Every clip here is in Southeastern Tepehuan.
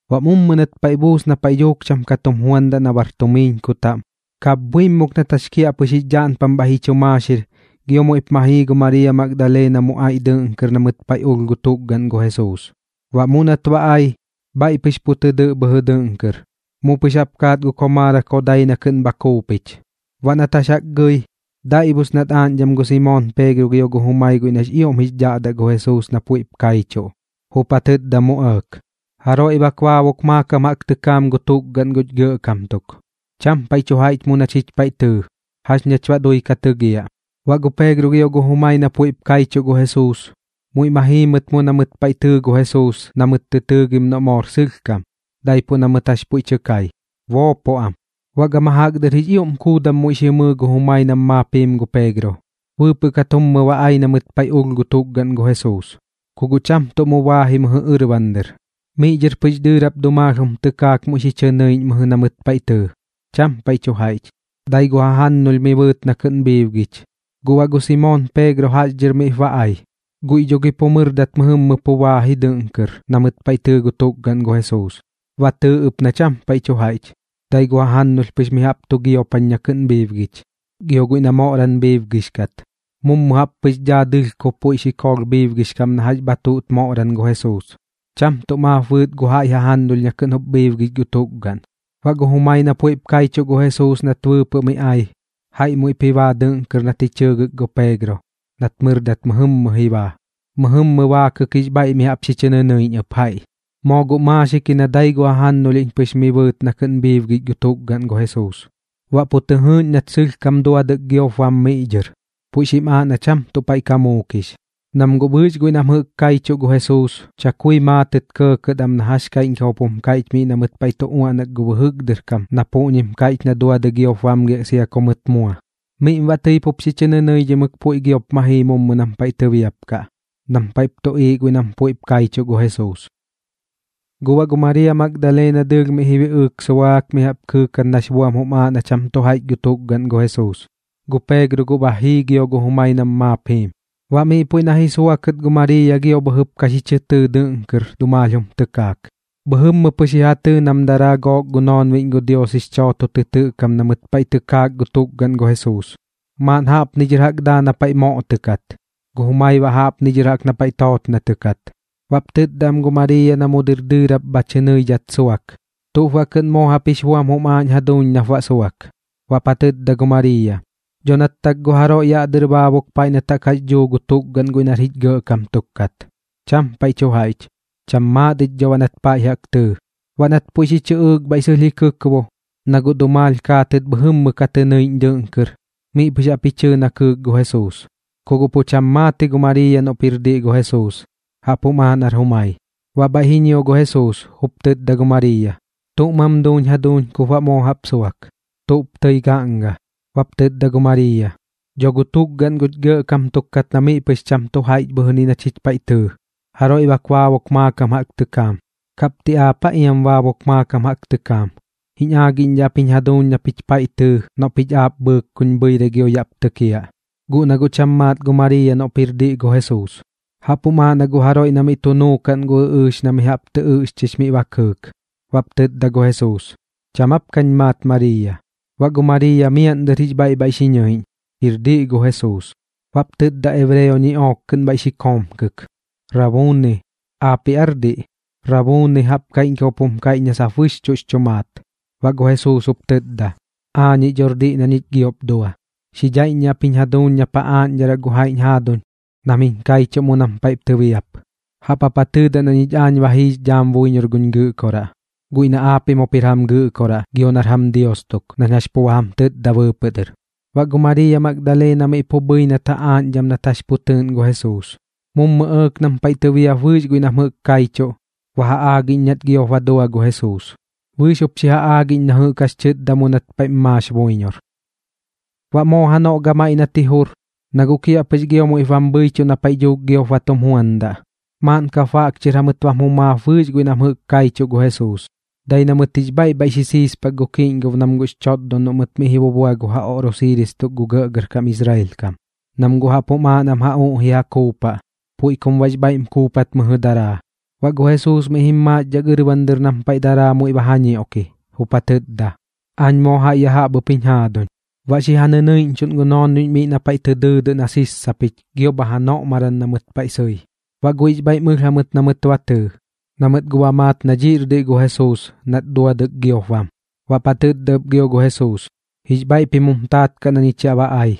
Baꞌ mummu nat paiꞌ buus na paiꞌ dhuuk cham ka tum juandaꞌ na bar tumiiñku taꞌm, kapbhuimuk nat jax kiaꞌpɨx jix dhaꞌnpam bhaiꞌ ji chu maaxir, gio muiꞌp ma jii gu Mariiya Magdaleena mu aiꞌ dɨꞌn kɨr na mɨt paiꞌ ulh gu tukgaꞌn gu Jesuus. Baꞌ mu nat ba ai, bhaiꞌ pɨx pu tɨ dɨꞌ bhɨjɨ dɨꞌn kɨr, mu pɨx jaꞌp kaat gu komaarak jodai na kɨꞌn bha kuupich. Baꞌ nat jax jaꞌk gɨi, daiꞌbus nat aaꞌñdham gu Simoon Peegro gio gu jumai guiꞌ nax ioꞌm jix dhaꞌdaꞌ gu Jesuus na puiꞌp kaichuꞌ, jup ja tɨtda mu ɇɇk: ―Jaroiꞌ bak baabuk maakam jaꞌk tɨkaam gu tukgaꞌn guch Gɇꞌkam tuk. Cham paiꞌ tu jaiꞌch mu na chich paiꞌ tɨɨ. ¿Jax nach baꞌ dui ka tɨgiaꞌ? Baꞌ gu Peegro gio gu jumai na puiꞌp kaichuꞌ gu Jesuus, muiꞌ ma jii mɨt mu na mɨt paiꞌ tɨɨ gu Jesuus na mɨt tɨ tɨɨgim noꞌ moor sɨlhkam, daipuꞌ na mɨt jax puiꞌ tɨ kai, boopoꞌ am. Baꞌ gama jaꞌk dɨr jix ioꞌm kuudam muiꞌ xi mɨɨ gu jumai nam maap jiim gu Peegro, bɨɨpɨꞌ kat jummɨ ba ai na mɨt paiꞌ ulh gu tukgaꞌn gu Jesuus. Ku guꞌ cham tuꞌ mu baa ji mɨjɨ ɨrban dɨr, miꞌ dhɨr pɨx dɨɨrap dumaalh jum tɨkaak muiꞌ xi chɨ nɨiꞌñ mɨjɨ na mɨt paiꞌ tɨɨ. Cham paiꞌ tu jaiꞌch, dai gu jajannulh mi bɨɨt na kɨꞌn bhiibgich. Guꞌ baꞌ gu Simoon Peegro jaꞌx dhɨr miꞌp ba ai. Guiꞌ dho gi guꞌ mɨrdat mɨjɨmmɨ pu baa ji dɨꞌn kɨr na mɨt paiꞌ tɨɨ gu tukgaꞌn gu Jesuus. Ba tɨɨ ɨp na cham paiꞌ tu jaiꞌch, dai gu jajannulh pɨx mi jaꞌp tu giopan na kɨꞌn bhiibgich. Gio guiꞌ na moꞌram bhiibgix kat, mummu jaꞌp pɨx daa dɨlhkob puiꞌ xikoolh bhiibgix kam na jax bha tuꞌt moꞌram gu Jesuus, cham tuꞌ maap bɨɨt gu jaiꞌ jajannulh na kɨꞌn jup bhiibgich gu tukgaꞌn. Baꞌ gu jumai na puiꞌp kaichuꞌ gu Jesuus nat bɨɨpɨꞌ miꞌ ai, jaiꞌ muiꞌp ji baa dɨꞌn kɨr nat ji chɨɨgɨk gu Peegro nat mɨrdat mɨjɨmmɨ ji baa. Mɨjɨmmɨ baakɨk jix bhaiꞌ mi jaꞌp xi chɨ nɨnɨiꞌñ ɨp jaiꞌ, moo guꞌ maaxik ji na dai gu jajannulhiꞌñ pɨx mi bɨɨt na kɨꞌn bhiibgich gu tukgaꞌn gu Jesuus. Baꞌ pu tɨ jɨɨꞌñ nat sɨlhkam duadɨk giop bam miꞌ dhɨr, puiꞌ xim aaꞌ na cham tuꞌ paiꞌ ka muukix. Nam guꞌ bɨɨx guiꞌ na jɨꞌk kaichuꞌ gu Jesuus, chakui maatɨt kɇɇkɇt am na jax kaiꞌñkam jup jum kaiꞌch miꞌ na mɨt paiꞌ tu uaꞌnak gu bɨjɨk dɨr kam na puꞌñim kaiꞌch na duadɨi giop bamgiaꞌ sia ku mɨt mua. Miꞌm baꞌ tɨi pup xi chɨ nɨnɨidhimɨk puiꞌ giop ma jii mummu nam paiꞌ tɨbiapkaꞌ, nam paiꞌp tuꞌiiꞌ guiꞌ nam puiꞌp kaichuꞌ gu Jesuus. Guꞌ baꞌ gu Mariiya Magdaleena dɨɨlh miꞌ ji biꞌɨɨk suaak mi jaꞌp kɨɨkat nax buam jum aaꞌ na cham tu jaiꞌch gu tukgaꞌn gu Jesuus. Gu Peegro guꞌ ba jii gio gu jumai nam maap jiim. Baꞌ miꞌ puiꞌ na ji suakɨt gu Mariiya gio bhɨjɨp ka xi chɨ tɨɨ dɨꞌn kɨr dumaalh jum tɨkaak. Bhɨjɨmmɨ pɨx ji ja tɨɨ nam daraa gook gu noonbiꞌñ gu Dios jix chooto tɨtɨꞌ kam na mɨt paiꞌ ka tɨkaak gu tukgaꞌn gu Jesuus, maaꞌn jaꞌpni dhɨr jaꞌk daa na paiꞌ moꞌtɨkat, gu jumai baꞌ miꞌ dhɨr jaꞌk na paiꞌ tootnatɨkat. Baꞌp tɨtda am gu Mariiya na mu dɨr dɨɨrap bha tɨ nɨidhat suak: ―¿Tuꞌp baꞌ kɨꞌn moo jaꞌp jix buam jum aaꞌñ jaduuñ nap baꞌ suak? Baꞌp ja tɨtda gu Mariiya: ―Dho nat tak gu jaroiꞌ yaꞌ dɨr baabuk paiꞌ nat jaꞌk jax dhuu gu tukgaꞌn guiꞌ nar jich gɇꞌkam tuk kat. Cham paiꞌ tu jaiꞌch. Cham maat ich dho baꞌ nat paiꞌ jaꞌk tɨɨ. Baꞌ nat puiꞌ xi chɨꞌɨɨk bhaiꞌ sɨlh ji kɨkbo, na guꞌ dumaalh kaatɨt bhɨjɨmmɨ ka tɨ nɨiꞌñ dɨꞌn kɨr, miꞌ pɨx jaꞌp ji chɨɨ na kɨɨk gu Jesuus. Ku guꞌ pu cham maat ji gu Mariiya noꞌp jir diꞌ gu Jesuus, jaꞌp jum aaꞌ nar jumai. Baꞌ bhaiꞌ ji ñio gu Jesuus, jup tɨtda gu Mariiya: ―¿Tuꞌ mam duuñ jaduuñ kup baꞌ moo jaꞌp suak? ¿Tuꞌp tɨi gaꞌnga? Baꞌp tɨtda gu Mariiya: ―Dho gu tukgaꞌn guch gɇꞌkam tuk kat na miꞌ pɨx cham tu jaiꞌch bhɨjɨni na chich paiꞌ tɨɨ. Jaroiꞌ bak baabuk maakam jaꞌk tɨkaam. ¿Kaꞌp ti aap aa iam baabuk maakam jaꞌk tɨkaam? Jiñ aagiꞌñdhaꞌ ap jiñ jaduuñ na pich paiꞌ tɨɨ noꞌ pich aap bhɨɨk kuñ bhɨirai gio yaꞌp tɨkiaꞌ. Guꞌ na guꞌ cham maat gu Mariiya noꞌp jir diꞌ gu Jesuus, jaꞌp jum aaꞌ na gu jaroiꞌ na miꞌ tu nuukaꞌn gu ɨꞌɨɨx na mi jaꞌp tɨ ɨꞌxchix miꞌ ba kɨɨk. Baꞌp tɨtda gu Jesuus: ―¿Cham aap kañ maat Mariiya? Baꞌ gu Mariiya miaꞌn dɨr jix bhaiꞌ bhaiꞌ xi ñɨiꞌñ, jir diꞌ gu Jesuus. Baꞌp tɨtda ebreo ñiꞌook kɨꞌn bhaiꞌ xi koomkɨk: ―¡Rabuuni! ¿Aapiꞌ aar diꞌ? Rabuuni jaꞌp kaiꞌñkam jup kaiꞌch na sap bɨxchuꞌx chu maat. Baꞌ gu Jesuus jup tɨtda: ―Aañiꞌ dhor diꞌ na ñich giop dua. Xi dhaiꞌññiaꞌ ap jiñ jaduuñ nap ja aaꞌñdharaꞌ gu jaiꞌñ jaaduñ nam jiñ kaichuꞌ mu nam paiꞌ tɨbiap. Jaꞌp jap ja tɨɨdaꞌ na ñich aañ ba jiix dhaam buiñor guñ Gɨꞌkoraꞌ guiꞌ na aapiꞌm jup jir jam Gɨꞌkoraꞌ gio baꞌ nar jam Dios tuk, nañ jax pu ba jam tɨtda bɨɨpɨꞌ dɨr. Baꞌ gu Mariiya Magdaleena miꞌ pu bhɨi nat ja aaꞌñdham nat jax pu tɨɨꞌn gu Jesuus. Mummu ɇɇk nam paiꞌ tɨbiap bɨɨx guiꞌ nam jɨꞌk kaichuꞌ, ba ja aagiꞌñ nat giop ba dua gu Jesuus, bɨɨx jup xi ja aagiꞌñ na jɨꞌk jax tɨtda mu nat paiꞌm maax buiñor. Baꞌ moo janoꞌ gamaiꞌ nat ji jur, na guꞌ kiaꞌpɨx gio muiꞌp bam bhɨichuꞌ na paiꞌ dhuuk giop ba tum juandaꞌ, maaꞌn kap baꞌk chɨr jamɨt bam jumaap bɨɨx guiꞌ nam jɨꞌk kaichuꞌ gu Jesuus. Dai na mɨt jix bhaiꞌ bhaiꞌ xi siispak gu kiꞌñgob nam guꞌx chotdon noꞌ mɨt miꞌ ji bubua gu ja oꞌrosiiris tuk gu gɇꞌgɇrkam Israel kam, nam guꞌ jaꞌp jum aaꞌ nam ja uꞌji ja kuupaꞌ, puiꞌ kum baꞌx bhaiꞌm kuupat mɨjɨ daraa. Baꞌ gu Jesuus miꞌ jim maaxdhak ɨrban dɨr nam paiꞌ daraa muiꞌ ba ja ñioꞌki, jup ja tɨtda: ―Aañ moo jaiꞌ ya jaꞌp ɨp jiñ jaaduñ. Baꞌ xi ja nɨnɨiꞌñchuꞌn gu noonbiꞌñ miꞌ na paiꞌ tɨ dɨɨdɨꞌ na sissapich gio bha janoꞌmaram na mɨt sɨi. Baꞌ guiꞌx bhaiꞌm ɨlh jamɨt na mɨt ba tɨɨ, na mɨt guꞌ ba maat na dhiꞌr diꞌ gu Jesuus nat duadɨk giop bam. Baꞌp ja tɨtda ɨp gio gu Jesuus: ―Jix bhaiꞌ pim jum taat kaꞌ na ñich yaꞌ ba ai.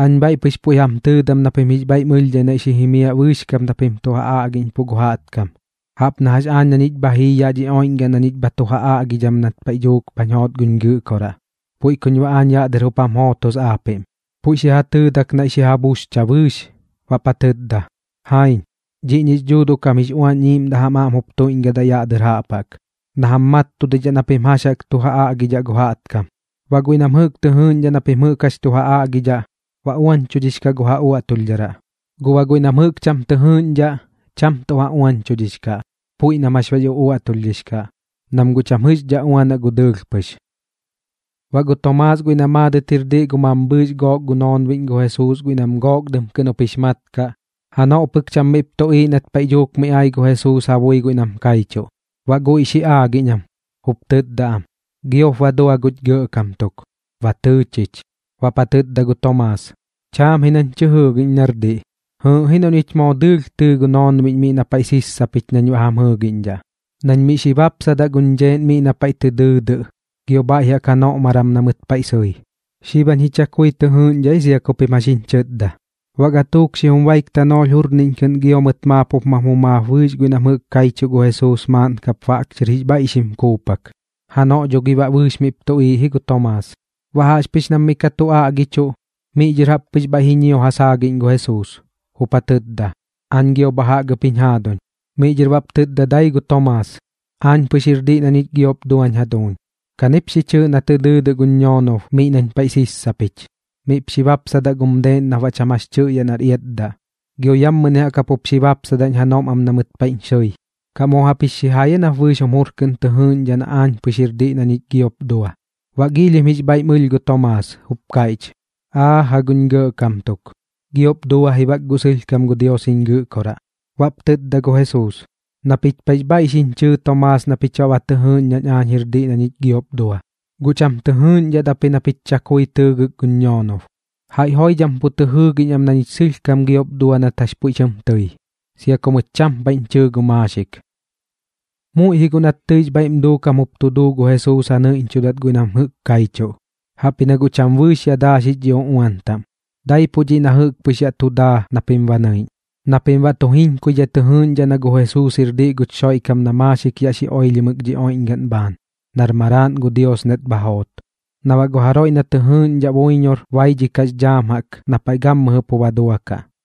Aañ bhaiꞌ pɨx puiꞌ jam tɨɨdam na pim jix bhaiꞌm ɨlhdhai naiꞌ xi jimiaꞌ bɨɨx kap na pim tu ja aꞌgiꞌñpuꞌ gu jaꞌtkam. Jaꞌp na jax aañ na ñich bha jii yaꞌ dhi oiꞌñgaꞌn na ñich bha tu jam aꞌgidham nat paiꞌ dhuuk bhañ joot guñ Gɨꞌkoraꞌ, puiꞌ kuñ baꞌ aañ yaꞌ dɨr jup jam jootos aapiꞌm. Puiꞌ xi ja tɨɨdak naiꞌ xi ja buxcha bɨɨx, baꞌp ja tɨtda: ―Jaiñ. Dhiꞌñix Dhuuduꞌ kam jix Uañ Iiꞌmdaꞌ jam aꞌm jup tuiꞌñgɨdaꞌ yaꞌ dɨr jaꞌp jaꞌk na jam mattudidhaꞌ na pim jax jaꞌk tu ja aꞌgidhaꞌ gu jaꞌtkam. Baꞌ guiꞌ nam jɨꞌk tɨ jɨɨꞌñdhaꞌ na pim jɨꞌk jax tu ja aꞌgidhaꞌ, baꞌ uañchudhix kaꞌ gu ja uaꞌtulhdharaꞌ. Guꞌ baꞌ guiꞌ nam jɨꞌk cham tɨ jɨɨꞌñdhaꞌ, cham tuꞌ ja uañchudhix kaꞌ, puiꞌ nam jax bax uꞌuaꞌtulhdhix kaꞌ, nam guꞌ cham jɨꞌxdhaꞌ uanaꞌ gu dɨɨlh pɨx. Baꞌ gu Tomaas guiꞌ na maadɨt jir diꞌ gu mambhɨɨx gook gu noonbiꞌñ gu Jesuus, guiꞌ nam Gook Dɨm kɨꞌn jup jix mat kaꞌ, janoꞌ pɨk cham miꞌp tuꞌiiꞌ nat paiꞌ dhuuk miꞌ ai gu Jesuus ja bui guiꞌ nam kaichuꞌ. Baꞌ guiꞌ xi aagiꞌñ am, jup tɨtda am: ―Giop ba dua guch Gɇꞌkam tuk. Ba tɨɨ chich. Baꞌp ja tɨtda gu Tomaas: ―Chaam ji nañ tɨ jɨɨgiꞌñ nar diꞌ. Jɨɨꞌ ji noꞌ ñich moo dɨɨlh tɨɨ gu noonbiꞌñ miꞌ na paiꞌ sissapich nañ baꞌ jam jɨɨgiꞌñdhaꞌ, nañ miꞌ xi bapsadaꞌ guñ dheeꞌn miꞌ na paiꞌ tɨ dɨɨdɨꞌ gio bhaiꞌ jaꞌk janoꞌmaram na mɨt paiꞌ sɨi. Xib jañ ji chakui tɨ jɨɨꞌñdhaꞌ ji sia ku pim jax jiñ chɨtda. Baꞌ gatuuk xijum baik tanoolh jurniꞌñ kɨꞌn gio mɨt maap jup mam jumaap bɨɨx guiꞌ nam jɨꞌk kaichuꞌ gu Jesuus maaꞌn kap baꞌk chɨr jix bhaiꞌ xim kuupak. Janoꞌ dho gi baꞌ bɨɨx miꞌp tuꞌiiꞌ ji gu Tomaas. Baꞌ jaꞌxpɨx nam miꞌ ka tu aꞌgichuꞌ, miꞌ dhɨr jaꞌp pɨx bhaiꞌ ji ñio ja saagiꞌñ gu Jesuus, jup ja tɨtda: ―Aañ gio bha jaꞌk ɨp jiñ jaaduñ. Miꞌ dhɨr baꞌp tɨtda dai gu Tomaas: ―Aañ pɨx jir diꞌ na ñich giop duañ jaduuñ. Kanip xi chɨɨꞌ na dɨɨdɨꞌ guñ ñoonob miꞌ nañ paiꞌ sissapich. Miꞌp xi bapsadaꞌ gum deeꞌn nap baꞌ cham jax tɨꞌyaꞌ nar iatdaꞌ, gio yammɨni jaꞌk jap jup xi bapsadaꞌñ janoꞌm am na mɨt paiꞌñ xɨi. ¿Kaꞌ moo jaꞌp jix xijai aa nap bɨɨx jum jur kɨꞌn tɨ jɨɨꞌñdhaꞌ nañ aañ pɨx jir diꞌ na ñich giop dua? Baꞌ giilhim jix bhaiꞌm ɨlh gu Tomaas, jup kaiꞌch: ―¡Aaja guñ Gɇꞌkam tuk! Giop dua ji bak guꞌ sɨlhkam gu Dios jiñ Gɨꞌkoraꞌ. Baꞌp tɨtda gu Jesuus: ―Na pich paiꞌx bhaiꞌ xiñ chɨɨ Tomaas na pich baꞌ ba tɨ jɨɨꞌñ nañ aañ jir diꞌ na ñich giop dua. Guꞌ cham tɨ jɨɨꞌñdhat ap ji na pich chakui tɨɨgɨk guñ ñoonob. Jaiꞌ joidham pu tɨ jɨɨgiꞌñ am na ñich sɨlhkam giop dua nat jax puiꞌ tɨm tɨi, sia ku mɨt cham paiꞌñ chɨɨ gu maaxik. Muiꞌ ji guꞌ nat tɨix bhaiꞌm duukam jup tu duu gu Jesuus ja nɨiꞌñchudat guiꞌ nam jɨꞌk kaichuꞌ, jaꞌpji na guꞌ cham bɨɨx ya daaxix dhi uꞌuan taꞌm. Daipuꞌ dhiꞌ na jɨꞌk pɨx yaꞌ tu daa na pim ba nɨiꞌñ, na pim baꞌ tu jiñkuidhai tɨ jɨɨꞌñdhaꞌ na gu Jesuus jir diꞌ guch Xoiꞌkam na maaxik yaꞌ xi oilhimɨk dhi oiꞌñgaꞌn bhaan, nar Maraaꞌn gu Dios nat bha joot. Na baꞌ gu jaroiꞌ na tɨ jɨɨꞌñdhaꞌ buiñor baidhikaꞌx dhaam jaꞌk na paiꞌ gammɨjɨ pu ba duakaꞌ.